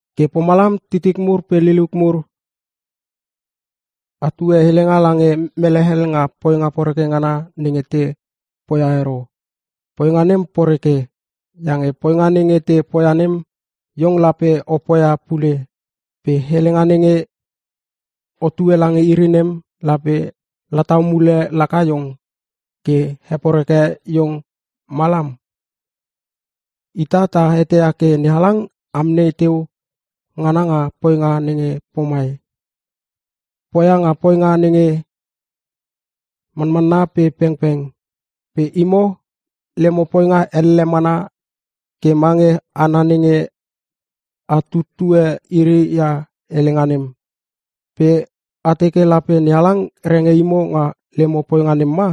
Ke pomalam titik mur pe liliuk mur, atue helenga lange mele hel nga poinga poreke ngana nenge te poia ero. Poinga nem poreke. Iange poinga nenge te poia nem iong lape o poia pule pe helenga nenge otue lange iri nem lape latau mule laka iong, ke heporeke iong malam. Ita ta eteia ke NeHalang amnei teu ngana nga poinga nenge pomai, poia nga poinga nge manmanna pe pengpeng. Pe imo, lemo poinga elle mana ke mange hana nenge a tutue iri ia helenga nem. Pe a teke lape NeHalang renge imo nga lemo poinga nem ma?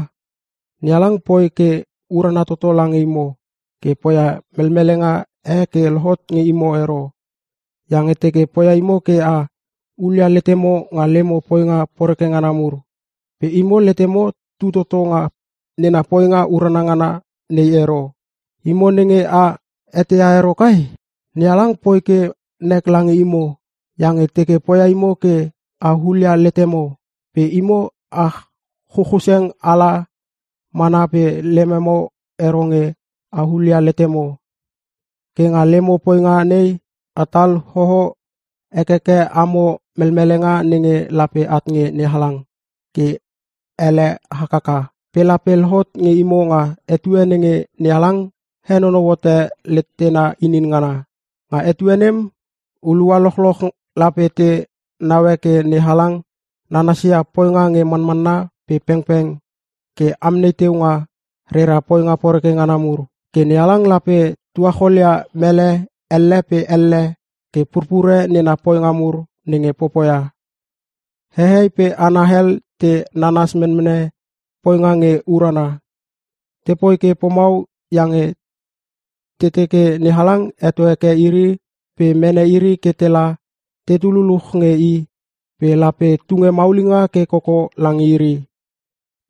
NeHalang poi ke urana toto lange imo ke poia melmelenga e ke lohot nge imo ero. Iange teke poia imo ke a hulia letemo nga lemo poinga poreke ngana mur. Pe imo letemo tu toto nga nena poinga urana ngana nei ero. Imo nge a eteia ero kai? NeHalang poi ke nek lange imo iange teke poia imo ke a hulia letemo. Pe imo a chuchuseng ala mana pe lememo ero nge a hulia letemo. Ke nga lemo poinga nei imo sipomo atal hoo hekeke amo melmelenga nenge lape at nge NeHalang ke ele hakaka. Pe lape lohot nge imo nga etue nenge NeHalang henonou hote letena inin ngana. Nga etue nem hulua lochloch lape te naue ke NeHalang nanasia poinga nge manmanna pe pengpeng ke amnei teu nga rera poinga poreke ngana mur. Ke NeHalang lape tuacholia mele elle pe elle ke purpure nena poinga mur nenge popoia. Hehei pe hana hel te nanas menmene poinga nge urana. Tepoi ke pomau iange te teke NeHalang heto heke iri pe mene iri ke la tetu luluch nge i pe lape tunge maulinga ke koko lange iri.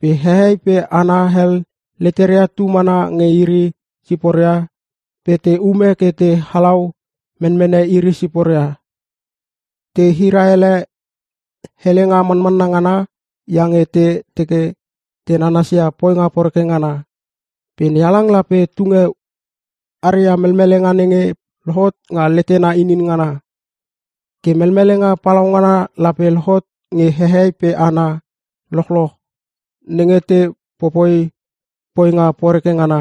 Pe hehei pe hana hel leteria tu mana nge iri siporia pe te ume ke te halau menmene iri siporia. Te hira ele helenga manmanna ngana iange te teke te nanasia poinga poreke ngana. Pe NeHalang lape tunge aria melmelenga nenge lohot nga letena inin ngana. Ke melmelenga palaungana lape lohot nge hehei pe hana lochloch nenge te popoi poinga poreke ngana: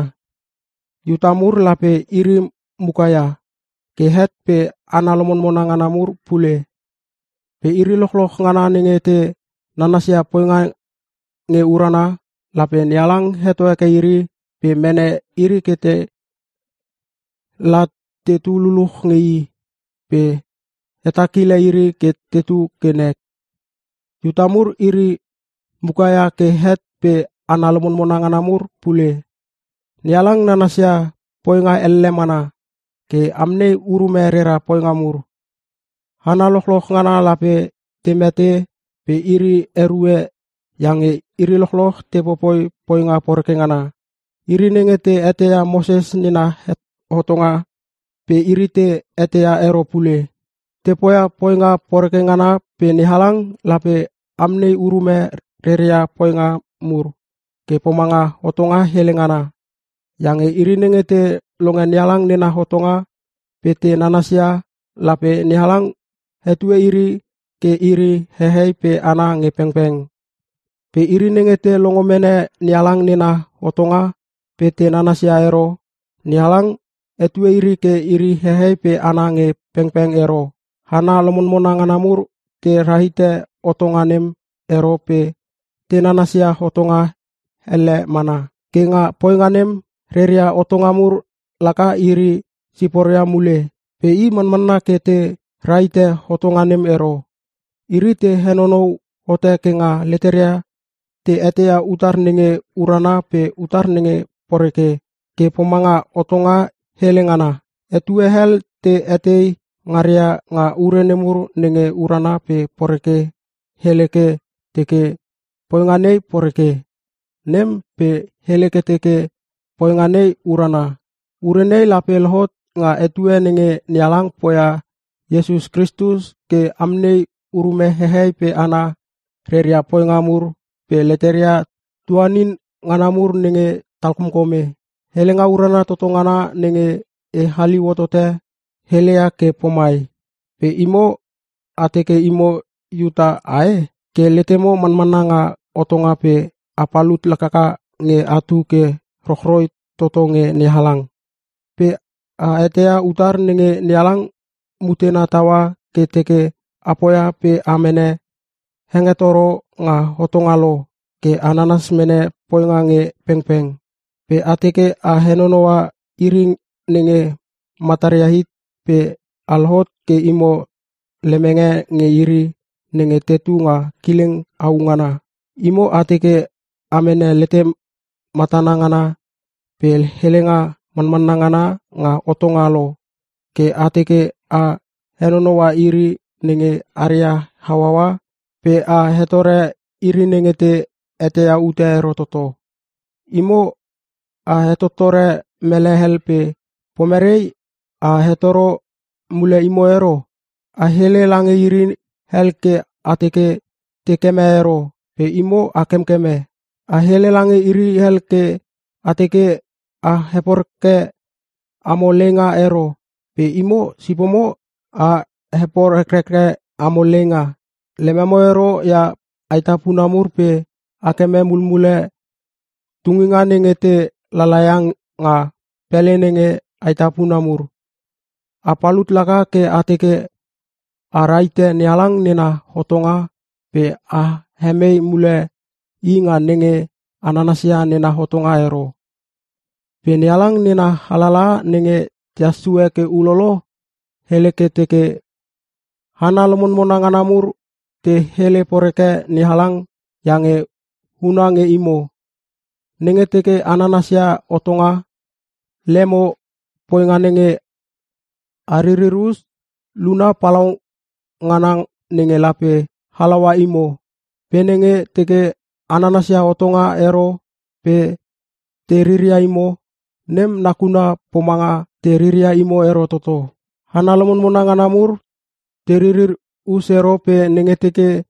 Iuta mur lape iri muka ia, ke het pe hana lomonmona ngana mur pule. Pe iri lochloch ngana nenge te nanasia poinga nge urana, lape NeHalang heto heke iri pe mene iri ke la tetu luluch nge i pe hetakile iri ke tetu ke nek. Iuta mur iri mukaia ke het pe hana lomonmona ngana mur pule. NeHalang nanasia poinga elle mana ke amnei urume rera poinga mur. Hana lochloch ngana lape te mete pe iri erue iange iri lochloch te popoi poinga poreke ngana. Iri nenge te eteia Moses nena hotonga pe iri te eteia ero pule. Te poia poinga poreke ngana pe NeHalang lape amnei urume reria poinga mur ke pomanga hotonga hele ngana. Iange iri nenge te longe NeHalang nena hotonga pe te nanasia lape NeHalang hetue iri ke iri hehei pe hana nge pengpeng. Pe iri nenge te longo mene NeHalang nena hotonga pe te nanasia ero, NeHalang hetue iri ke iri hehei pe hana nge pengpeng ero. (Hana lomonmona ngana mur te rahite hotonga nem ero pe te nanasia hotonga hele ngana. Ke nga poinga nem, reria hotonga mur laka iri siporia mule. Pe i manmanna ke te rahite hotonga nem ero. Iri te henonou hote ke nga leteria te eteia utar nenge urana pe utar nenge poreke ke pomanga hotonga hele ngana. Etue hel te etei ngaria nga ure nemur nenge urana pe poreke hele ke teke poinga nei poreke, nem pe hele ke teke poinga nei urana.) Ure nei lape lohot nga etue nenge NeHalang poia Iesus Kristus ke amnei urume hehei pe hana reria poinga mur pe leteria tuanin ngana mur nenge talkomkome. Helenga urana toto ngana nenge e haliu hotote, heleia ke pomai. Pe imo, a teke imo Iuta ae? Ke letemo manmanna nga hotonga pe a palut laklaka nge atu ke rochroi toto nge NeHalang. Pe a eteia utar nenge NeHalang mutena taua ke teke a poia pe a mene hengetoro nga hotonga lo ke a nanas mene poinga nge pengpeng. Pe a teke a henonoua iri nenge mataria hit pe a lohot ke imo lemenge nge iri nenge tetu nga kileng au ngana. Imo a teke a mene letematana ngana pe helenga manmanna ngana nga hotonga lo, ke a teke a henonoua iri nenge aria hauaua pe a hetore iri nenge te eteia ute e ero toto. Imo a hetottore mele hel pe pomerei a hetoro mule imo ero? A hele lange iri hel ke a teke te keme ero pe imo a kemkeme. A hele lange iri hel ke a teke a heporeke amo leinga ero pe imo sipomo a heporekreke amo leinga. Lememo ero ia aetapuna mur pe a keme mulmule tunginga nenge te lalaia nga pele nenge aetapuna mur. A palut laka ke a teke a rahite NeHalang nena hotonga pe a hemei mule i nga nenge a nanasia nena hotonga ero. Pe NeHalang nena alalaha nenge tehas sue ke ulolo, hele ke teke, “Hana lomonmona ngana mur te hele poreke NeHalang iange huna nge imo.” Nenge teke a nanansia hotonga, lemo poinga nenge a ririr us, luna palaungana nenge lape halaua imo. Pe nenge teke a nanasia hotonga ero pe te riria imo, nem nakuna pomanga te riria imo ero toto. Hana lomonmona ngana mur te ririr us ero pe nenge teke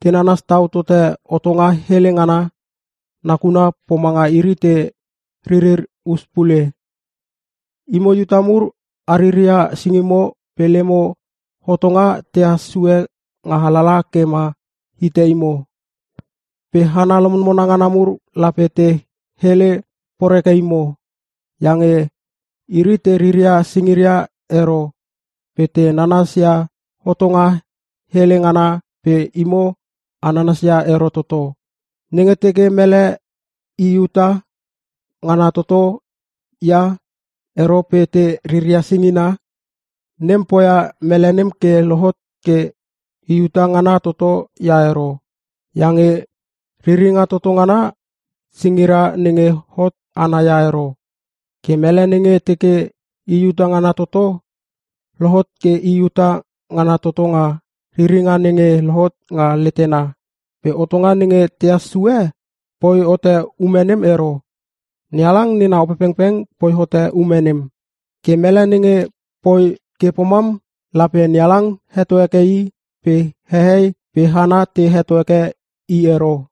te nanas tau tote hotonga hele ngana, nakuna pomanga iri te ririr us pule. Imo Iuta mur ariria singimo pe lemo hotonga tehas sue nga alalaha ke ma hite imo. Pe hana lomonmona ngana mur lape te hele poreke imo. Iange iri te riria singiria ero pe te nanas ia hotonga hele ngana pe imo a nanasia ero toto. Nenge teke mele i Iuta ngana toto ia ero pe te riria singina, nem poia mele nem ke lohot ke i Iuta ngana toto ia ero. Iange riringa toto ngana, singira nenge hot ana ia ero. Ke mele nenge teke i Iuta ngana toto, lohot ke i Iuta ngana toto nga riringa nenge lohot nga letena. Pe hotonga nenge tehas sue poi hote ume nem ero, NeHalang nena Opepengpeng poi hote ume nem. Ke mele nenge poi ke pomam lape NeHalang heto heke i pe hehei pe hana te heto heke i ero.